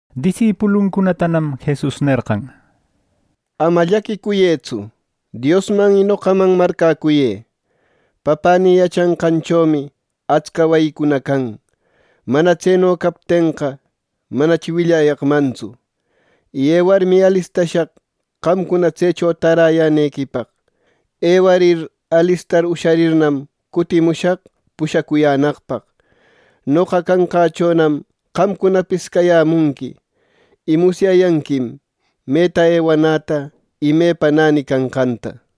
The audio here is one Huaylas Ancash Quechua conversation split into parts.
Disipuluncunatanam Jesus nerqan: “Ama llaquicuyëtsu. Diosman y noqaman marcäcuyë. Papänï yachanqanchomi atsca wayicuna can. Mana tseno captenqa, manachi willayaqmantsu. Y ewarmi, alistashaq qamcuna tsecho täräyänequipaq. Ewarir alistar usharirnam, cutimushaq pushacuyänaqpaq. Noqa canqächonam qamcunapis cayämunqui. Y musyayanquim meta ewanäta y mepa näni canqanta” nishpa.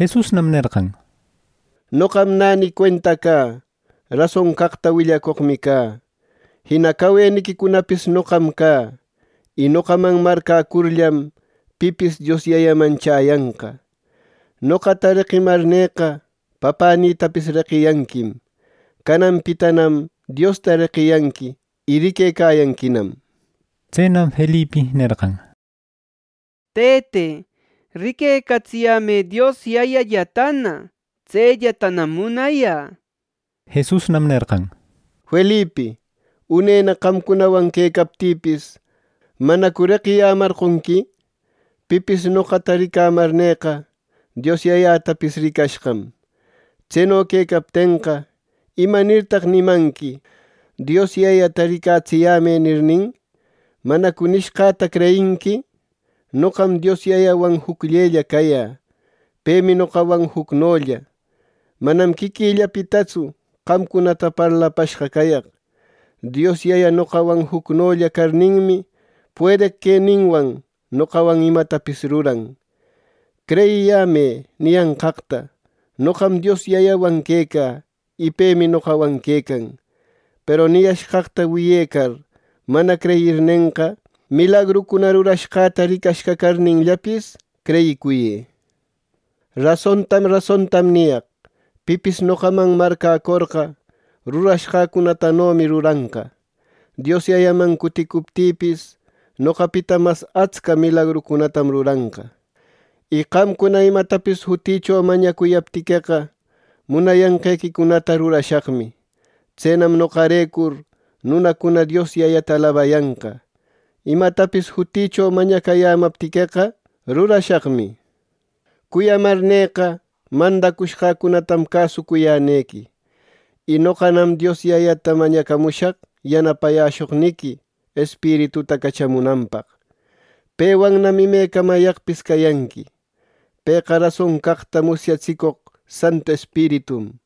Jesusnam nerqan: —Noqam näni cuenta cä. Rason caqta willacoqmi cä. Jina caweniquicunapis noqam cä. Y noqaman marcäcurllam pipis Dios Yayaman chäyanqa. Noqata reqimarnïqa Papänïtapis reqiyanquim. Cananpitanam Diosta reqiyanqui, y riquecayanquinam —nir. Tsenam Felipi nerqan: —Tëte, riquecatsiyämë Dios Yayallatana. Tsellatanam munayä —nishpa. Jesusnam nerqan: —Felipi, unena qamcunawan quecaptïpis, ¿manacu reqiyämarqonqui? Pipis noqata ricamarnïqa Dios Yayatapis ricashqam. Tseno quecaptenqa, ¿imanirtaq nimanqui ‘Dios Yayata ricatsiyämë’ nirnin? ¿Manacu nishqaqta creyinqui? Noqam Dios Yayawan jucllella cayä; pemi noqawan jucnolla. Manam quiquillapitatsu qamcunata parlapashqa cayaq. Dios Yaya noqawan jucnolla carninmi puedeq queninwan noqawan imatapis ruran. Creyiyämë niyanqaqta noqam Dios Yayawan quecä, y pemi noqawan quecan. Peru niyashqaqta wiyecar mana creyirnenqa, milagrucuna rurashqäta ricashqa carninllapis creyicuyë. Rasontam rasontam niyaq: Pipis noqaman marcäcorqa rurashqäcunatanomi ruranqa. Dios Yayaman cuticuptïpis, noqapita mas atsca milagrucunatam ruranqa. Y qamcuna imatapis jutïcho mañacuyaptiqueqa, munayanqequicunata rurashaqmi. Tsenam noqarecur nunacuna Dios Yayata alabayanqa. Imatapis jutïcho mañacayämaptiqueqa rurashaqmi —nir. “Cuyamarnïqa mandacushqäcunatam cäsucuyänequi. Y noqanam Dios Yayata mañacamushaq yanapayäshoqniqui Espirituta cachamunanpaq. Pewannam imecamayaqpis cayanqui. Pëqa rason caqta musyatsicoq Santu Espiritum.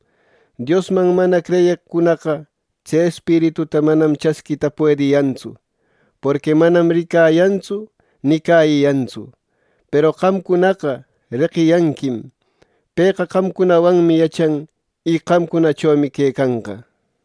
Diosman mana creyeqcunaqa tse Espirituta manam chasquita puediyantsu, porqui manam ricayantsu ni cäyiyantsu. Peru qamcunaqa reqiyanquim. Pëqa qamcunawanmi yachan. Y qamcunachomi quecanqa.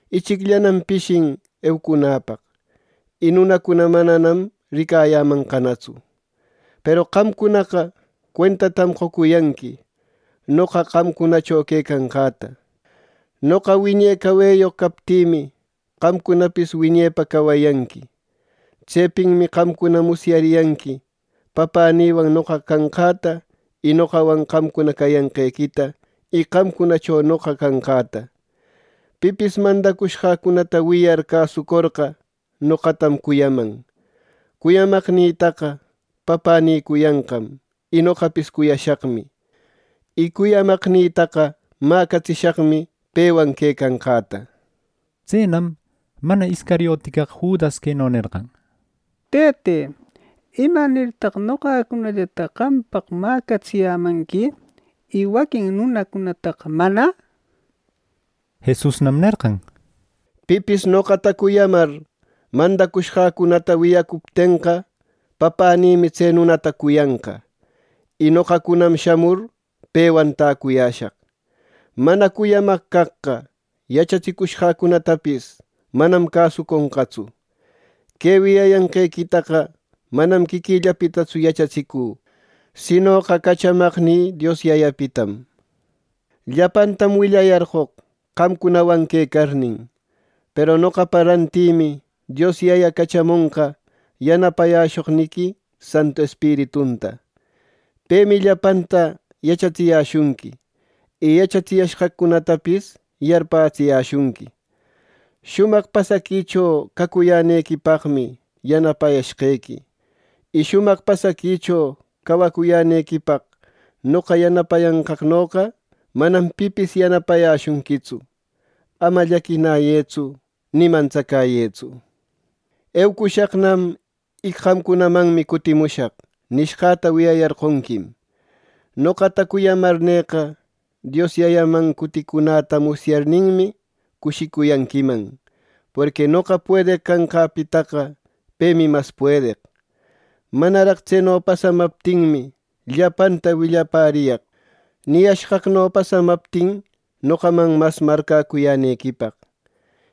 Ichicllanam pishin eucunäpaq, y nunacuna mananam ricayämanqanatsu. Peru qamcunaqa cuentatam qocuyanqui noqa qamcunacho quecanqäta. Noqa wiñe caweyoq captïmi, qamcunapis wiñepa cawayanqui. Tsepinmi qamcuna musyariyanqui Papänïwan noqa canqäta, y noqawan qamcuna cayanqequita y qamcunacho noqa canqäta. Pipis mandacushqäcunata wiyar cäsucorqa noqatam cuyaman. Cuyamaqnïtaqa Papänï cuyanqam, y noqapis cuyashaqmi. Y cuyamaqnïtaqa mäcatsishaqmi pewan quecanqäta” nir. Tsenam (mana Iscariote) caq Judas queno nerqan: —Tëte, ¿imanirtaq noqacunallataqa qampaq mäcatsiyämanqui y waquin nunacunataqa mana? —nir. Jesusnam nerqan: —Pipis noqata cuyamar mandacushqäcunata wiyacuptenqa, Papänïmi tse nunata cuyanqa. Y noqacunam shamur pewan täcuyäshaq. Mana cuyamaq caqqa yachatsicushqäcunatapis manam cäsuconqatsu. Que wiyayanqequitaqa manam quiquïllapitatsu yachatsicü, sinoqa cachamaqnï Dios Yayapitam. “Llapantam willayarqoq qamcunawan quecarnin. Peru noqapa rantïmi Dios Yaya cachamonqa yanapayäshoqniqui Santu Espiritunta. Pemi llapanta yachatsiyäshunqui. Y yachatsiyashqaqcunatapis yarpätsiyäshunqui. “Shumaq pasaquicho cacuyänequipaqmi yanapashqequi, y shumaq pasaquicho cawacuyänequipaq noqa yanapayanqaqnoqa manam pipis yanapayäshunquitsu. Ama llaquinayëtsu ni mantsacäyëtsu. ‘Eucushaqnam y qamcunamanmi cutimushaq’ nishqäta wiyayarqonquim. Noqata cuyamarnïqa Dios Yayaman cuticunäta musyarninmi cushicuyanquiman, porqui noqa puedeq canqäpitaqa pemi mas puedeq. Manaraq tseno pasamaptinmi llapanta willapäriyaq, niyashqaqno pasamaptin noqaman mas marcäcuyänequipaq.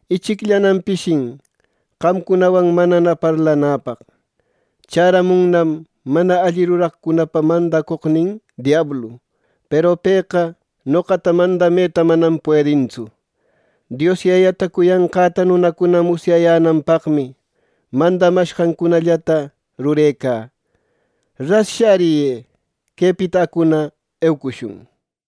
“Ichicllanam pishin qamcunawan manana parlanäpaq. Chäramunnam mana alli ruraqcunapa mandacoqnin diablu. Peru pëqa noqata mandameta manam puedintsu. Dios Yayata cuyanqäta nunacuna musyayänanpaqmi mandamashqancunallata rurecä. “¡Ras shäriyë! ¡Quepita acuna eucushun!” nir.